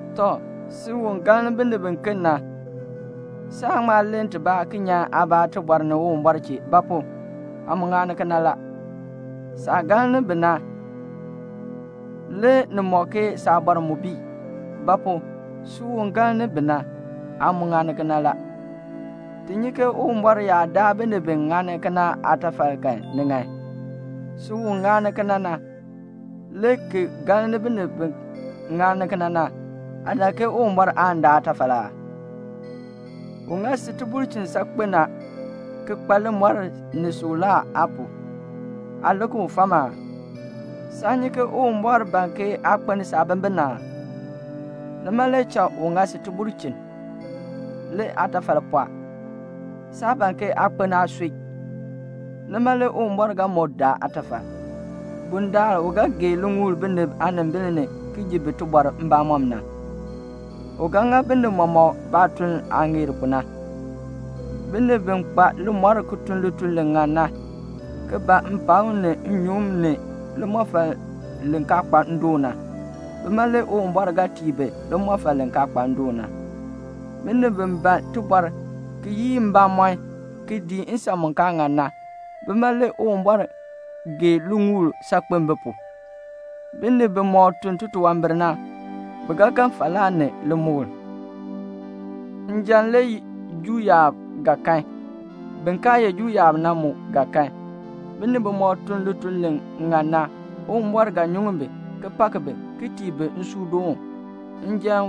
Tɔ, si u galn binib biken na, saan ŋma len tibaa ki nyan aabaa tibɔr ni Uwumbɔr chee; ba pu? aa mu ŋani kena la. Saah galn bi na, le ni mɔk ke saabɔr mu bii; ba pu? si u galni bi na, aa mu ŋani kena la. Ti nyi ke Uwumbɔr yaa daa binib bi ŋani kena na aatafal kan, ni ŋan. Si u ŋani kena na, le ki galni biken bi ŋani kena na, aa dak ke Uwumbɔr aan daa aatafal aa? U ŋa si tibulchin saakpen a, ki kpa limɔr ni suklaa aa pu. Aa lik u fam aa? Saan nyi ke Uwumbɔr ban ke aa kpeln saabimbin aa? Nima le cha u ŋa si tibulchin. Le aatafal pɔɔ. Saa ban ke aa kpeln aasui. Nima le Uwumbɔr ga moo daa aatafal, bundaln u ga gee liŋuul binib aanimbil ni ki ji bi tibɔr mbamɔm na. U ga ŋa binib mɔmɔk baatuln aah ŋeer pu na. Binib bi kpa limɔr ki tun lituln li ŋan na, ki ban mpakm ni nnyuŋ ni limɔfal li kaa kpa ndoon na, bima le Uwumbɔr ga tii bi limɔfal li kaa kpa ndoon na. Binib bi ban tibɔr, ki yii mbamɔn, ki dii nsan mu kaa ŋan na, bima le Uwumbɔr gee liŋuul saakpen bi pu. Binib bimɔk tun titunwambir na, bi ga kan falaa ni limukl. Njan le Juu yaab ga kan. Bin kaa ye Juu yaab na mu ga kan. Binib bimɔk tun lituln li ŋan na, Uwumbɔr ga nyuŋ bi, ki pak bi, ki tii bi nsuudoon.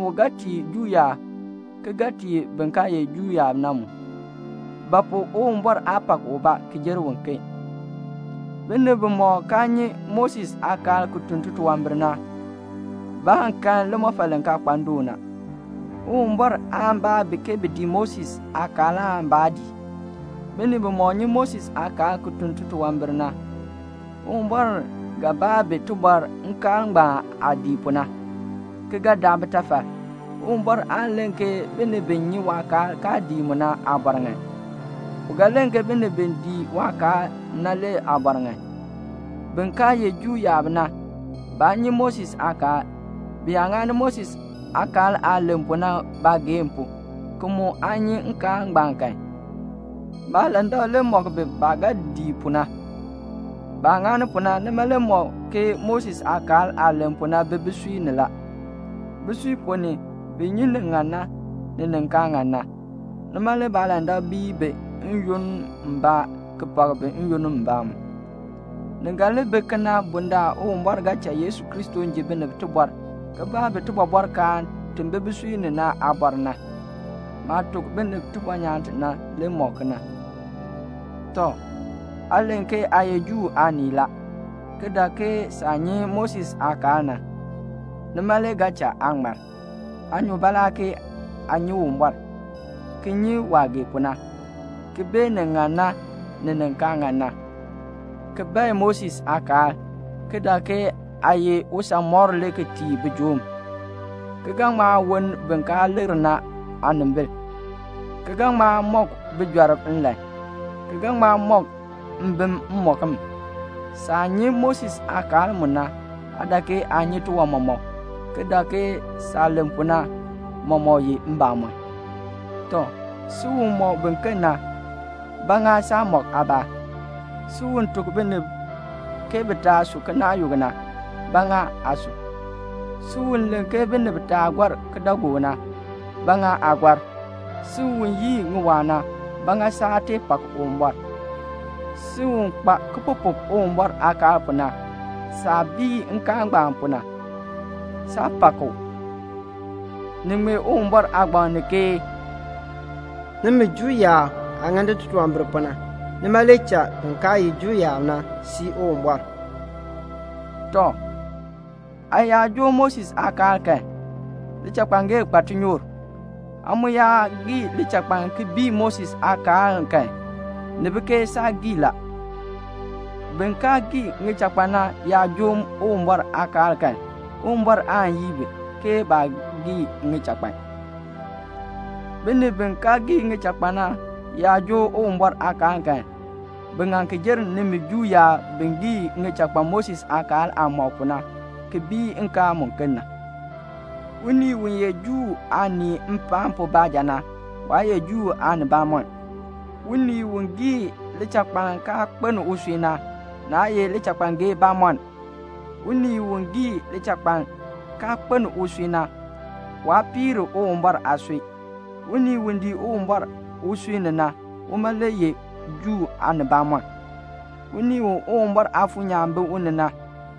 U ga tii Juu yaab njan, ki ga tii bin kaa ye Juu yaab na mu; ba pu? Uwumbɔr aa pak ubaa ki jer uken. Binib bimɔk kaa nyi Moses aakaal ki tun titunwambir na, baan kan limɔfal li kaa kpa ndoon na. Uwumbɔr aan baa bi ke bi dii Moses aakaal aan baa dii. Binib bimɔk nyi Moses aakaal ki tun titunwambir na, Uwumbɔr ga baa bi tibɔr nkaal ngbaan aah dii pu na, ki ga daa bitafal. Uwumbɔr aan len ke binib bi nyi waakaal kaa dii mu na aabɔr ŋan. U ga len ke binib bi dii waakaal na le aabɔr ŋan. Bin kaa ye Juu yaab na, baa nyi Moses aakaal. Bi yaa ŋani Moses aakaal aah len pu na baageehn pu, ki mu aa nyi nkaal ngbaan kan, baalandak le mɔk bi baah ga dii pu na. Baah ŋani pu na, nima le mɔk ke Moses aakaal aah len pu na bi bisui ni la. Bisui ponn ni, bi nyi ni ŋan na, ni ni kaa ŋan na. Nima le baalandak bii bi n-yoonn mbaa, ki pak bi n-yoonn mbaa mu. Ni ga li bi kena bundaln Uwumbɔr ga cha Yesu Kristo ji binib tibɔr, ki baa bi tibɔbɔrkaan ti bi bisui ni na aabɔr na. Maah tuk binib tibɔnyaan ti na, le mɔk kena. Tɔ, aa len ke aa ye Juu aanii la, ki dak ke saah nyi Moses aakaal na, nima le ga cha aa ŋmar; aa nyu baalaa ke aa nyi Uwumbɔr, ki nyi waah gee pu na, ki bee ni ŋan na, ni ni kaa ŋan na, ki bae Moses aakaal, ki dak ke aa ye usanmɔkr le ki tii bijoom, ki ga ŋma woln bin kaa likr na aanimbil, ki ga ŋma mɔk bijɔrb nlan, ki ga ŋma mɔk mbim mmɔkm. Saah nyi Moses aakaal mu na, aa dak ke aa nyi tiwan mɔmɔk, ki dak ke saah len pu na mɔmɔk ye mbamɔn. Tɔ, si u mɔk biken na, ba ŋa saa mɔk aabaa? Si u tuk binib ke bi taa su kinaayuk na, ba ŋa aa su? Si u len ke binib taa gɔr kidaagook na, ba ŋa aa gɔr? Si u yii ŋiwaa na, ba ŋa saa tee pak Uwumbɔr? Si u kpa kipupuk Uwumbɔr aakaal pu na, saah bii nkaal ngbaan pu na, saa pak u. Ni ŋmee Uwumbɔr Aagbaŋ ponn ni ke "Nimi Juu yaab aah ŋani titunwambir pu na, nima le cha bin kaa ye Juu yaab na sii Uwumbɔr." Tɔ, aa yaa joo Moses aakaal kan, lichakpangee kpa tinyoor. Aa mu yaa gii lichakpaln ki bii Moses aakaal kan, ni bi ke saa gii la. Bin kaa gii ŋichakpan na yaa joo Uwumbɔr aakaal kan, Uwumbɔr aan yii bi, ke baa gii ŋichakpan. Binib bi kaa gii ŋichakpan na yaa joo Uwumbɔr aakaal kan, bi ŋan ki jer nimi Juu yaab bi gii ŋichakpan Moses aakaal aah mɔk pu na, ki bii nkaal muken na. Unii u ye Juu aanii mpaan pu baanja na, waa ye Juu aanibamɔnn. Unii u gii lichakpaln kaa kpeln usui na, naa ye lichakpangee bamɔnn. Unii u gii lichakpaln, kaa kpeln usui na, waa piir Uwumbɔr aasui. Unii u dii Uwumbɔr usui ni na, uma le ye Juu aanibamɔnn. Unii u Uwumbɔr Aafuur nyaan bi u ni na,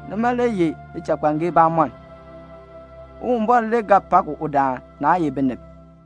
nima le ye lichakpangee bamɔnn. Uwumbɔr le ga pak udaan, naa ye binib.